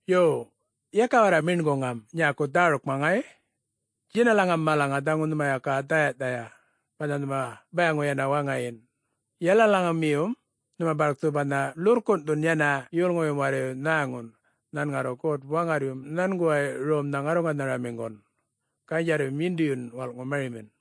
Yo, yaka warra meṉguŋam nyäku dhärukma ŋay! Djinalaŋam malaŋa dhaŋu nhuma yaka dhäya-dhäya, banha nhuma bayaŋu yana waŋayin, yalalaŋumiyum nhuma barkthu banha ḻurrkunꞌthun yana yolŋuyum warrayu nhäŋun nhan ŋarru God-Waŋarryum nhanguway romnham ŋarruŋanharamiŋgun, ganydjarryum yindiyun walꞌŋu marimin.”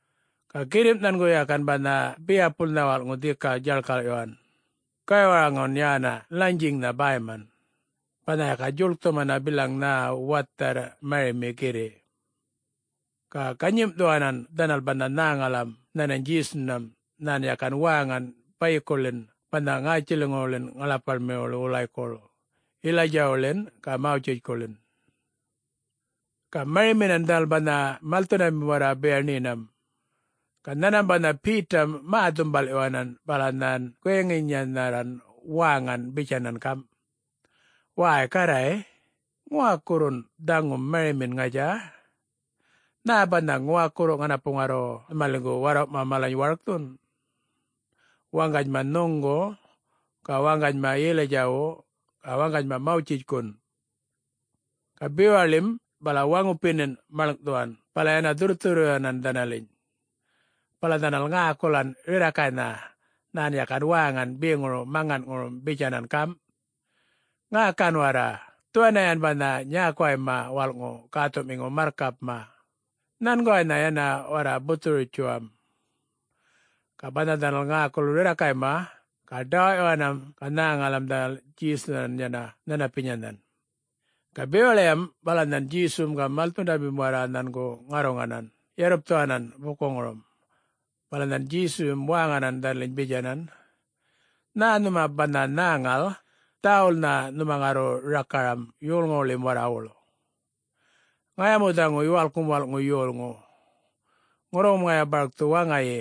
Ga girrimꞌ nhangu yakan banha biyapulnha walꞌŋu dhika djaḻkarrꞌyuwan, gaywaraŋun yana lanyiŋnha bäyman, banha yaka djuḻkthumana bilaŋ nhä watharr marimi girriꞌ. Ga ganyimꞌthuwanan dhanal banha nhäŋalam nhanany Djesunham nhan yakan wäŋan bayikuḻin banha ŋätjiliŋuwuḻin ŋaḻapaḻwuḻi wulaykuḻ, Yilaydjawuḻin ga Mawtjitjkuḻin. Ga mariminan dhanal banha malthundamim warra biyaṉiyinam, ga nhanmam banha Betam mä-dhumbalꞌyuwanan bala nhan guyaŋinyanharran wäŋan bitjanan gamꞌ, “Wäy Garray, ŋuwakurrun dhaŋum marimin, ŋatja? Nhä banha ŋuwakurru ŋanapu ŋarru nhumaliŋgu warrawꞌma malany warkthun?... waŋganyma nhuŋgu ga waŋganyma Yilaydjawu ga waŋganyma Mawtjitjkun?” Ga bewaḻim bala waŋupinin maḻŋꞌthuwan bala yana dhurrthurrꞌyuwanan dhanaliny. Bala dhanal ŋäkulan rirrakaynha nhan yakan wäŋan beŋuru maŋanŋurum bitjanan gamꞌ, “Ŋäkan warra! Dhuwaniyan banha nyäkuwayma walꞌŋu gäthuꞌmiŋu marrkapma. Nhanguwaynha yana warra buthuru-bitjuwam!” Ga banha dhanal ŋäkul rirrakayma, ga ḏawaꞌyuwanam, ga nhäŋalam dhanal Djesunhan yana nhanapinyaynhan. Ga bewaḻiyam bala nhan Djesum ga malthundamim warra nhangu ŋarruŋanan yarrupthuwanan bukuŋurum. Bala nhan Djesuyum wäŋanan dhanaliny bitjanan, “Nhä nhuma banha nhäŋal, dhäwulnha nhuma ŋarru rakaram yolŋuwuḻim warrawuḻ. Ŋaya mu dhaŋu Yuwalkŋum Walꞌŋu Yolŋu. Ŋurruŋum ŋaya barkthu waŋayi,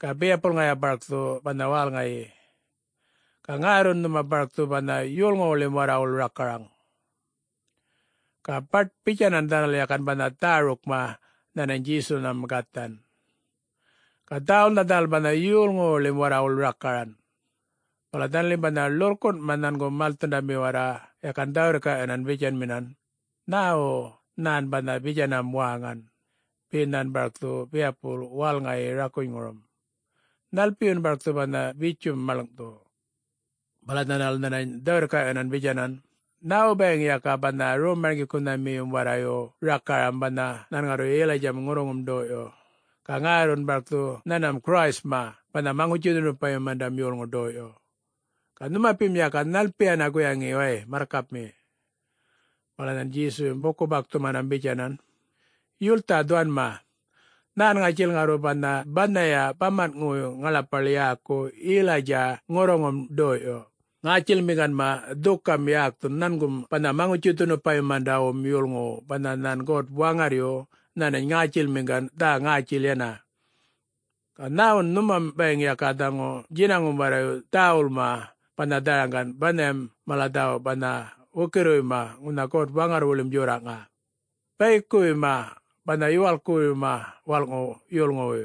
ga biyapul ŋaya barkthu banha wälŋayi. Ga ŋärrun nhuma barkthu banha yolŋuwuḻim warrawuḻ rakaraŋ.” Ga baṯ-bitjanan dhanal yakan banha dhärukma nhanany Djesunham gathan, ga dhäwulnha dhanal banha yolŋuwuḻim warrawuḻ rakaran. Bala dhanalim banha ḻurrkunꞌma nhangu malthundami warra yakan dhä-wirrkaꞌyunmin bitjanminan, “Nhäwu nhan banha bitjanam wäŋan? Be nhan barkthu biyapul wälŋayi rakunyŋurum? Nhalpiyun barkthu banha bitjum maḻŋꞌthu?” Bala dhanal nhanany dhä-wirrkaꞌyuwanan bitjanan, “Nhäwu bayiŋ yaka banha Rom-marŋgikunhamiyum warrayu rakaram banha nhan ŋarru Yilaydjam ŋurruŋum ḏoyꞌyu, ga ŋärrun barkthu nhanmam Christma banha Maŋutji-dhunupayumandam yolŋu ḏoyꞌyu? Ga nhunupim yaka nhalpiyana guyaŋi way, Marrkapmi?” Bala nhan Djesuyum buku-bakthumanam bitjanan, “Yultha dhuwanma. Nhän ŋatjil ŋarru banha banhaya bamanꞌŋuwuy ŋaḻapaḻ yäku Yilaydja ŋurruŋum ḏoyꞌyu, ŋätjilmiŋganma dhukam yäkthun nhangum banha Maŋutji-dhunupayumandawum Yolŋuwu banha nhan God-Waŋarryu nhanany ŋätjilmiŋgan dhä-ŋätjil yana. Ga nhäwun nhumam bayiŋ yaka dhaŋu djinaŋum warrayu dhäwulma banha dharaŋgan banhayam mala dhäwu banha wukirriwuyma ŋunha God-Waŋarrwuḻim djorraꞌŋa, bayikuwuyma banha Yuwalkkuruyma Walꞌŋu Yolŋuwuy?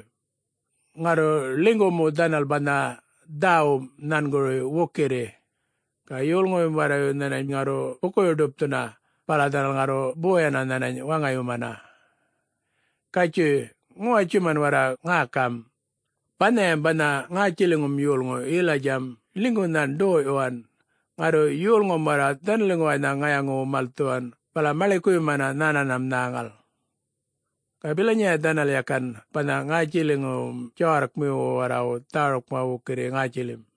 Ŋarru ḻinygu mu dhanal banha dhäwum nhanguruy wukirri, ga yolŋuyum warrayu nhanany ŋarru bukuyu-ḏupthuna bala dhanal ŋarru boyana nhanany waŋayumana. Gatjuy, ŋuwatjuman warra ŋäkam! Banhayam banha ŋätjiliŋum yolŋu Yilaydjam ḻinygu nhan ḏoyꞌyuwan. Ŋarru yolŋum warra dhanaliŋguwaynha ŋayaŋuwu malthuwan bala maḻikuyumanan nhananham nhäŋal. Ga bilanyaya dhanal yakan banha ŋätjiliŋuyum djawarrkmiyu warrayu dhärukma wukirri ŋätjilim.”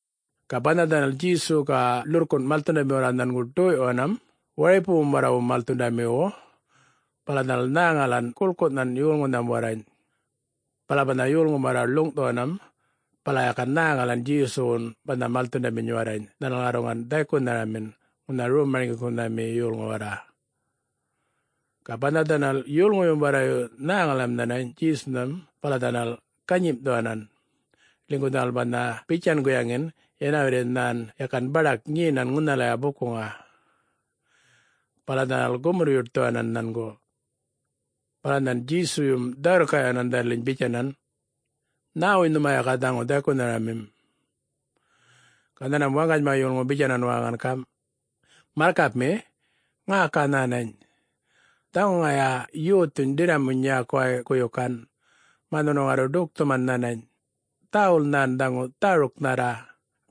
Ga banha dhanal Djesu ga ḻurrkunꞌ malthundami warra nhangu ḏoyꞌyuwanam waripuwum warrawu malthundamiwu, bala dhanal nhäŋalan guḻkunhan yolŋunham warrany. Bala banha yolŋum warra ḻuŋꞌthuwanan bala yakan nhäŋalan Djesuwun banha malthundaminy warrany dhanal ŋarruŋan dhaykunharamin ŋunha rom-marŋgikunhami yolŋu warra. Ga banha dhanal yolŋuyum warrayu nhäŋalam nhanany Djesunham bala dhanal ganyimꞌthuwanan, ḻinygu dhanal banha bitjan guyaŋin yana warri nhan yakan baḏak nyenan ŋunhalaya bukuŋa. Bala dhanal gumurr-yuṯthuwanan nhangu. Bala nhan Djesuyum dhä-wirrkaꞌyuwanan dhanaliny bitjanan, “Nhäwuy nhuma yaka dhaŋu dhaykunhamim?” Ga nhanmam waŋganyma yolŋu bitjanan wäŋan gamꞌ, “Marrkapmi, ŋäka nhänany! Dhaŋu ŋaya yothuny ḏirramuny nyäkuway guyukan, mä nhunu ŋarru ḏukthuman nhanany. Dhäwul nhan dhaŋu dhäruknharra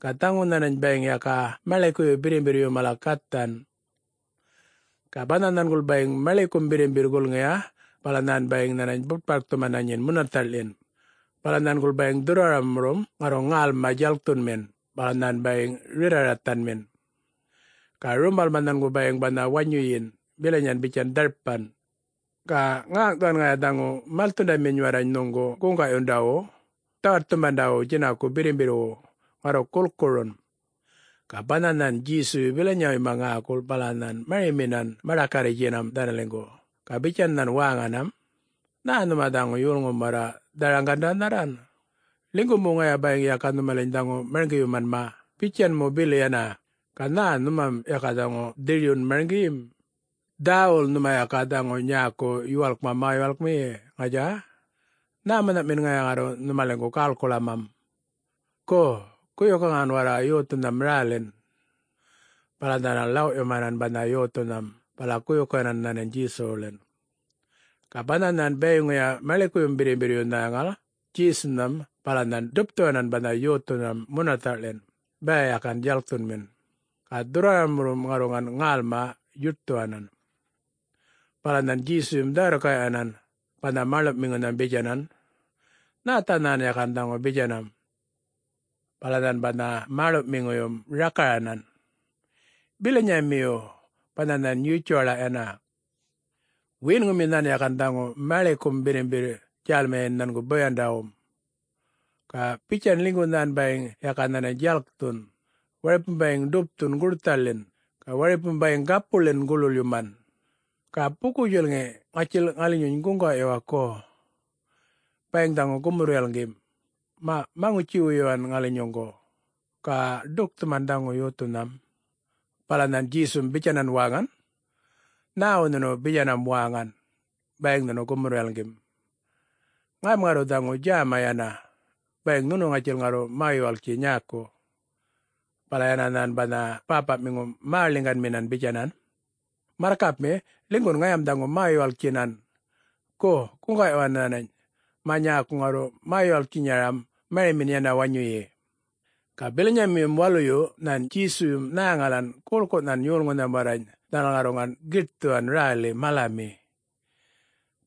ga dhaŋu nhanany bayiŋ yaka maḻikuyu birrimbirryu mala gathan. Ga banha nhanguḻ bayiŋ maḻikum birrimbirr gulŋiya bala nhan bayiŋ nhanany butparkthumana nyin munathaꞌḻin. Bala nhanguḻ bayiŋ dhurrwaraŋurum ŋarruŋ ŋälma djalkthunmin bala nhan bayiŋ rirra-rathanmin. Ga rumbalma nhangu bayiŋ banha wanyuyin bilanyan bitjan dharpan. Ga ŋäŋꞌthuwan ŋaya dhaŋu malthundaminy warrany nhuŋgu guŋgaꞌyundawu, dhawaṯthumandawu djinaku birrimbirrwu, ŋarru gulkurun.” Ga banha nhan Djesuyu bilanyawuyma ŋäkul bala nhan mariminan maḏakarritjtjinam dhanaliŋgu ga bitjan nhan wäŋanam, “Nhä nhuma dhaŋu yolŋum warra dharaŋgandanharran, linygu mu ŋaya bayiŋ yaka nhumaliny dhaŋu marŋgiyumanma bitjan mu bili yana, ga nhä nhumam yaka dhaŋu dhiryun marŋgiyim? Dhäwul nhuma yaka dhaŋu nyäku yuwalkma mä-yuwalkmiyi, ŋatja? Nhämunhaꞌmin ŋaya ŋarru nhumaliŋgu gäḻkuḻamam? Gu, guyukaŋan warra yothunham rälin!” Bala dhanal ḻawꞌyumanan banha yothunham bala guyukaŋan nhanany Djesuwuḻin. Ga banha nhan bayiŋuya maḻikuyum birrimbirryu nhäŋal Djesunham bala nhan ḏupthuwanan banha yothunham munathaꞌḻin, baya yakan djalkthunmin, ga dhurrwaramurrum ŋarruŋan ŋälma yuṯthuwanan. Bala nhan Djesuyum dhä-wirrkaꞌyuwanan banha mäḻuꞌmiŋunham bitjanan, “Nhätha nhan yakan dhaŋu bitjanam?” Bala nhan banha mäḻuꞌmiŋuyum rakaranan, “Bilanyamiyu banha nhan yutjuwaḻa yana. Wiyinŋumi nhan yakan dhaŋu maḻikum birrimbirr djälmiyi nhangu boyandawum. Ga bitjan ḻinygu nhan bayiŋ yaka nhanany djalkthun, waripum bayiŋ ḏupthun gurthaḻin ga waripum bayiŋ gapuḻin guḻwuḻyuman. Ga buku-djulŋi ŋatjil ŋalinyuny guŋgaꞌyuwa, gu? Bayiŋ dhaŋu gumurr-yalŋgim, maꞌ maŋutji-wuyuwan ŋalinyuŋgu, ga ḏukthuman dhaŋu yothunham.” Bala nhan Djesum bitjanan wäŋan, “Nhäwu nhunu bitjanam wäŋan, ‘Bayiŋ dhaŋu gumurr-yalŋgim’? Ŋayam ŋarru dhaŋu djäma yana, bayiŋ nhunu ŋatjil ŋarru mä-yuwalktji nyäku!” Bala yana nhan banha bäpaꞌmiŋum mäḻiŋganminan bitjanan, “Marrkapmi, ḻinygun ŋayam dhaŋu mä-yuwalktjinan. Gu, guŋgaꞌyuwan nhänany mä nyäku ŋarru mä-yuwalktjinyaram marimin yana wanyuyi.” Ga bilanyamiyum waluyu nhan Djesuyum nhäŋalan guḻkunhan yolŋunham warrany dhanal ŋarruŋan giṯthuwan räli malami.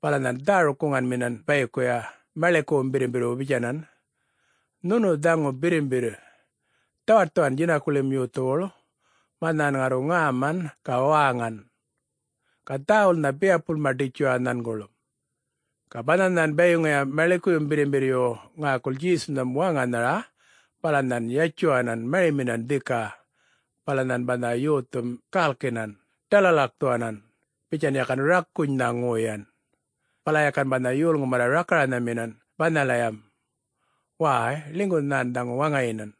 Bala nhan dhäruk-guŋanminan bayikuya maḻikuwum birrimbirrwu bitjanan, “Nhunu dhaŋu birrimbirr, dhawaṯthuwan djinakuḻim yothuwuḻ, mä nhan ŋarru ŋäman ga wäŋan! Ga dhäwulnha biyapulma ḏitjuwa nhanguḻ.” Ga banha nhan bayiŋuya maḻikuyum birrimbirryu ŋäkul Djesunham wäŋanhara, bala nhan yatjuwanan mariminan dhika. Bala nhan banha yothum gälkinan, ḏalalakthuwanan, bitjan yakan rakunynha ŋoyan. Bala yakan banha yolŋum warra rakaranhaminan banhalayam, “Wäy, ḻinygun nhan dhaŋu waŋayinan!”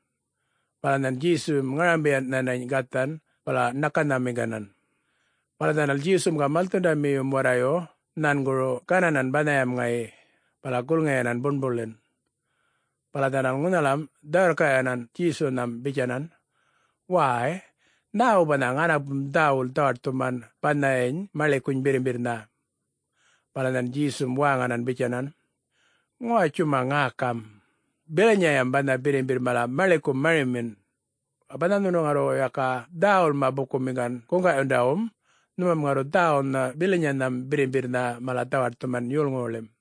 Bala nhan Djesuyum ŋarambiyan nhanany gathan bala ṉakanhamiŋganan. Bala dhanal Djesum ga malthundamiyum warrayu nhanguru gananan banhayam ŋayi, bala gulŋiyanan buṉbuḻin. Bala dhanal ŋunhalam dhä-wirrkaꞌyuwanan Djesunham bitjanan, “Wäy, nhäwu banha ŋanapum dhäwul dhawaṯthuman banhayam maḻikuny birrimbirrnha?” Bala nhan Djesum wäŋanan bitjanan, “Ŋuwatjuma ŋäkam! Bilanyayam banha birrimbirr mala maḻikun marimin. Ga banha nhuma ŋarru yaka dhäwulma bukumiŋgan guŋgaꞌyundawum, nhumam ŋarru dhäwulnha bilanyanham birrimbirrnha mala dhawaṯthuman yolŋuwuḻim.”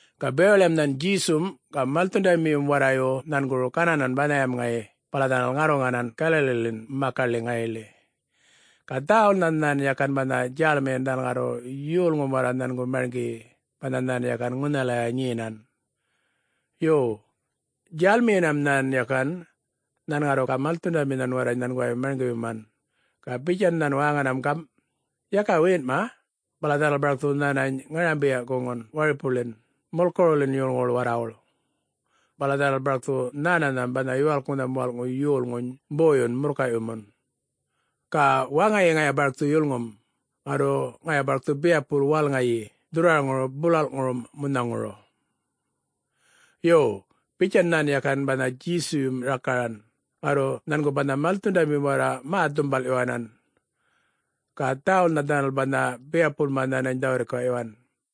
Ga bewaḻiyam nhan Djesum ga malthundamiyum warrayu nhanguru gananan banhayam ŋayi bala dhanal ŋarruŋan Galaliḻin makaḻi ŋayiḻi. Ga dhäwulnha nhan yakan banha djälmiyin dhanal ŋarru yolŋum warra nhangu mariŋgiyi banha nhan yakan ŋunhalaya nyenan. Yo, djälmiyinam nhan yakan, nhan ŋarru ga malthundaminhan warrany nhanguway marŋgiyuman. Ga bitjan nhan wäŋanam gamꞌ, “Yaka wiyinꞌma, bala dhanal barkthu nhänany ŋarambiyaꞌ-guŋun waripuwuḻin mulkuruwuḻin yolŋuwuḻ warrawuḻ. Bala dhanal barkthu nhänanham banha Yuwalknham Walꞌŋu Yolŋuny boyun murrkayꞌyumun. Ga waŋayi ŋaya barkthu yulŋum, ŋarru ŋaya barkthu biyapul wälŋayi dhurrwaraŋuru bulalꞌŋurum munhaŋuru.” Yo bitjan nhan yakan banha Djesuyum rakaran, ŋarru nhangu banha malthundamim warra mä-dhumbalꞌyuwanan. Ga dhäwulnha dhanal banha biyapulma nhanany dhä-wirrkaꞌyuwan.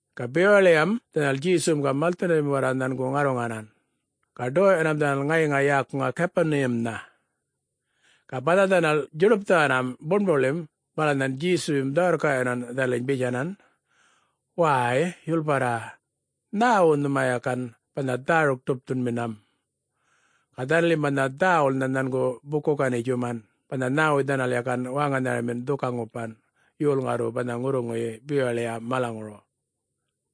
Ga bewaḻiyam dhanal Djesum ga malthundamim warra nhangu ŋarruŋanan, ga ḏoyꞌyuwan dhanal ŋayiŋa yäkuŋa Gapuniyamnha. Ga banha dhanal djuḏupthuwanam buṉbuḻim bala nhan Djesuyum dhä-wirrkaꞌyuwanan dhanaliny bitjanan, “Wäy, yulparra, nhäwuy nhuma yakan banha dhäruk-ḏupthunminam?” Ga dhanalim banha dhäwulnha nhangu buku-ganitjuman banha nhäwuy dhanal yakan wäŋanharamin dhuka-ŋupan, yol ŋarru banha ŋurruŋuyi bewaḻiya malaŋuru.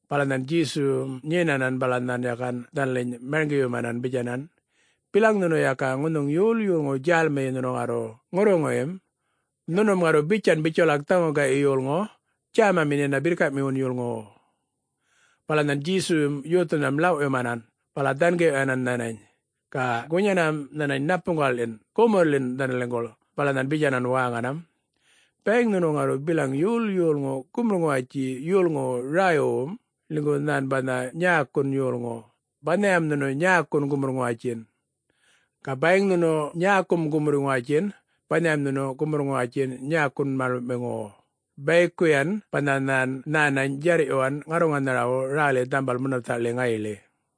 Bala nhan Djesum nyenanan bala nhan yakan dhanaliny marŋgiyumanan bitjanan, “Bilaŋ nhunu yaka ŋunhuŋ yol yolŋu djälmiyi nhunu ŋarru ŋurruŋuyim, nhunum ŋarru bitjan bitjuwalak dhaŋu gayꞌ yolŋu, djämamin yana birrkaꞌmiwun yolŋuwu.” Bala nhan Djesuyum yothunham ḻawꞌyumanan bala dhangiꞌyuwanan nhanany, ga gunyanam nhanany ṉapuŋgaꞌḻin gumurrḻin dhanaliŋguḻ, bala nhan bitjanan wäŋanam, “Bayiŋ nhunu ŋarru bilaŋ yol yolŋu gumurr-ŋuwatji yolŋuwu räywuywum, ḻinygu nhan banha nyäkun yolŋu, banhayam nhunu nyäkun gumurr-ŋuwatjin. Ga bayiŋ nhunu nyäkum gumurr-ŋuwatjin, banham nhunu gumurr-ŋuwatjin nyäkun mäḻuꞌmiŋuwu, bayikuyan banha nhan nhänany djarrꞌyuwan ŋarruŋanharawu räli dhambal munathaꞌḻi ŋayiḻi.”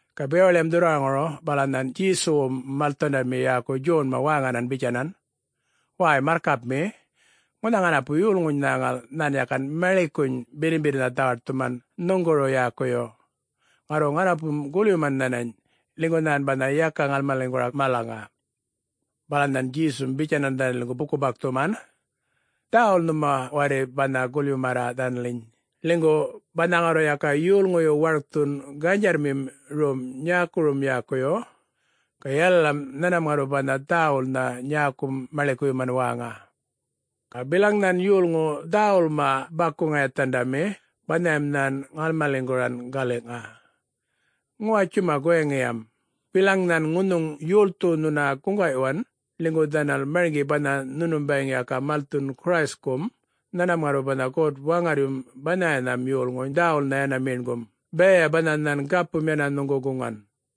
Ga bewaḻiyam dhurrwaraŋuru bala nhan Djesuwum malthundami yäku Djonma wäŋanan bitjanan, “Wäy, Marrkapmi, ŋunha ŋanapu yolŋuny nhäŋal nhan yakan maḻikuny birrimbirrnha dhawaṯthuman nhuŋguru yäkuyu. Ŋarru ŋanapum gulyuman nhanany, ḻinygu nhan banha yaka ŋalmaliŋgura malaŋa.” Bala nhan Djesum bitjanan dhanaliŋgu buku-bakthuman, “Dhäwul nhuma warri banha gulyumarra dhanaliny, ḻinygu banha ŋarru yaka yolŋuyu warkthun ganydjarrmim rom nyäkurum yäkuyu, ga yalalam nhanmam ŋarru banha dhäwulnha nyäkum maḻikuyuman wäŋa. Ga bilaŋ nhan yolŋu dhäwulma baku-ŋayathandami, banhayam nhan ŋalmaliŋguran galiꞌŋa. Ŋuwatjuma guyaŋiyam! Bilaŋ nhan ŋunhuŋ yolthu nhuna guŋgaꞌyuwan ḻinygu dhanal marŋgi banha nhunum bayiŋ yaka malthun Christ-kum, nhanmam ŋarru banha God-Waŋarryum banhayanham yolŋuny dhäwulnha yana meṉgum, bayaya banha nhan gapum yana nhuŋgu guŋan.”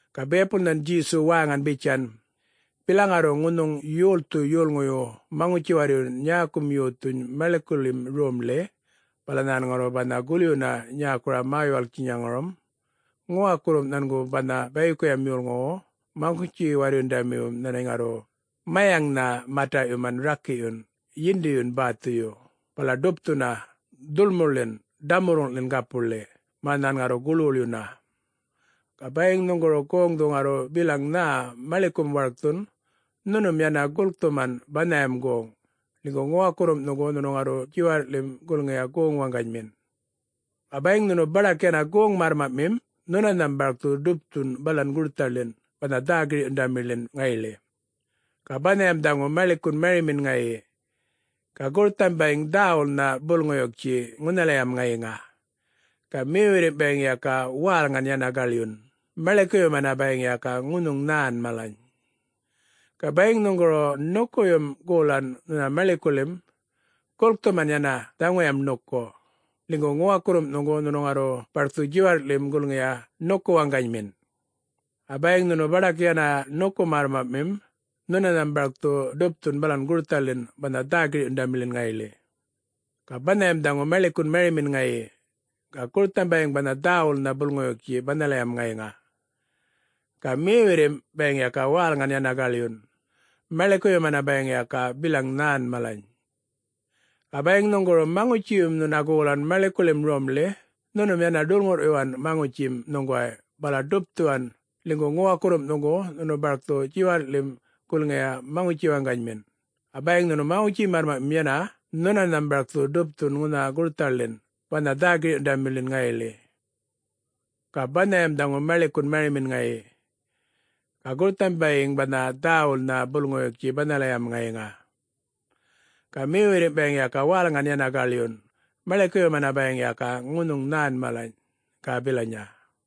Ga biyapul nhan Djesu wäŋan bitjan, “Bilaŋ ŋarru ŋunhuŋ yolthu yolŋuyu maŋutji-warryun nyäkum yothuny maḻikuḻim romḻi, bala nhan ŋarru banha gulyuna nyäkuru mä-yuwalktjinyaŋurum, ŋuwakurrum nhangu banha bayikuyam yolŋuwu maŋutji-warryundamiwum nhanany ŋarru mayaŋꞌnha mataꞌyuman rakiꞌyun, yindiyun bäthuyu, bala ḏupthuna dhulmuḻin ḏamurruŋꞌḻin gapuḻi, mä nhan ŋarru guḻwuḻyuna. Ga bayiŋ nhuŋguru goŋdhu ŋarru bilaŋ nhä maḻikum warkthun, nhunum yana gulkthuman banhayam goŋ, ḻinygu ŋuwakurrum nhuŋgu nhunu ŋarru djiwarrꞌḻim gulŋiyi goŋ waŋganymin. Ga bayiŋ nhunu baḏak yana goŋ-märrmaꞌmim, nhunanham barkthu ḏupthun balan gurthaḻin banha dhä-girꞌyundamiḻin ŋayiḻi. [Ga banhayam dhaŋu maḻikun marimin ŋayi. Ga gurtham bayiŋ dhäwulnha bulŋuyuktji ŋunhalayam ŋayiŋa. Ga mewirrimꞌ bayiŋ yaka wälŋan yana gaḻyun, maḻikuyumana bayiŋ yaka ŋunhuŋ nhän malany.] Ga bayiŋ nhuŋguru ṉukuyum goḻan nhuna maḻikuḻim, gulkthuman yana dhaŋuyam ṉuku, ḻinygu ŋuwakurrum nhuŋgu nhunu ŋarru barkthu djiwarrꞌḻim gulŋiyi ṉuku waŋganymin. Ga bayiŋ nhunu baḏak yana ṉuku märrmaꞌmim nhunanham barkthu ḏupthu balan gurthaḻin banha dhä-girꞌyundamiḻin ŋayiḻi. [Ga banhayam dhaŋu maḻikun marimin ŋayi. Ga gurtham bayiŋ banha dhäwulnha bulŋuyuktji banhalayam ŋayiŋa. Ga mewirrimꞌ bayiŋ yaka wälŋan yana gaḻyun, maḻikuyumana bayiŋ yaka bilaŋ nhän malany.] Ga bayiŋ nhuŋguru maŋutjiyum nhuna golan maḻikuḻim romḻi, nhunum yana ḏulŋurrꞌyuwan maŋutjim nhuŋguway bala ḏupthuwan, ḻinygu ŋuwakurrum nhuŋgu nhunu barkthu djiwarrꞌḻim gulŋiyi maŋutji waŋganymin, ga bayiŋ nhunu maŋutji märrmaꞌmim yana, nhunanham barkthu ḏupthu ŋunha gurthaḻin banha dhä-girꞌyundamiḻin ŋayiḻi. ‘Ga banhayam dhaŋu maḻikun marimin ŋayi. Ga gurtham bayiŋ banha dhäwulnha bulŋuyuktji banhalayam ŋayiŋa, ga mewirrimꞌ bayiŋ yaka wälŋan yana gaḻyun maḻikuyuman bayiŋ yaka ŋunhuŋ nhän malany,’ ga bilanya.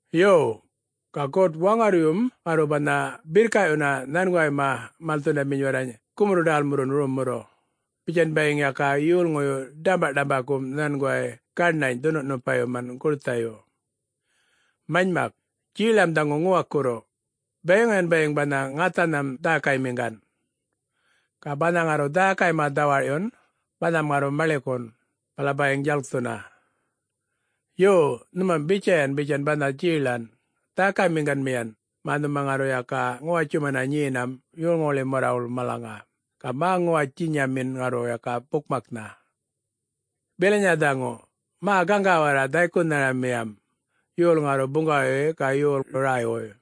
Yo, ga God-Waŋarryum ŋarru banha birrkaꞌyunna nhanguwayma malthundaminy warrany gumurr-ḏälmurrun rommurru, bitjan bayiŋ yaka yolŋuyu ḏämbaꞌḏambakum nhanguway gaṉany dhunupayuman gurthayu. Manymak, djeꞌlam dhaŋu ŋuwakurru, bayiŋuyan bayiŋ banha ŋathanham dhäkaymiŋgan. Ga banha ŋarru dhäkayma dhawarꞌyun banham ŋarru maḻikun, bala bayiŋ djalkthuna. Yo, nhumam bitjayan bitjan banha djeꞌlan, dhäkaymiŋganmiyan mä nhuma ŋarru yaka ŋuwatjumana nyenam yolŋuwuḻim warrawuḻ malaŋa, ga mä-ŋuwatjinyamin ŋarru yaka bukmaknha. [Bilanya dhaŋu! Mä gaŋga warra dhaykunharamiyam, yol ŋarru buŋgawayi ga yol räywuy!”]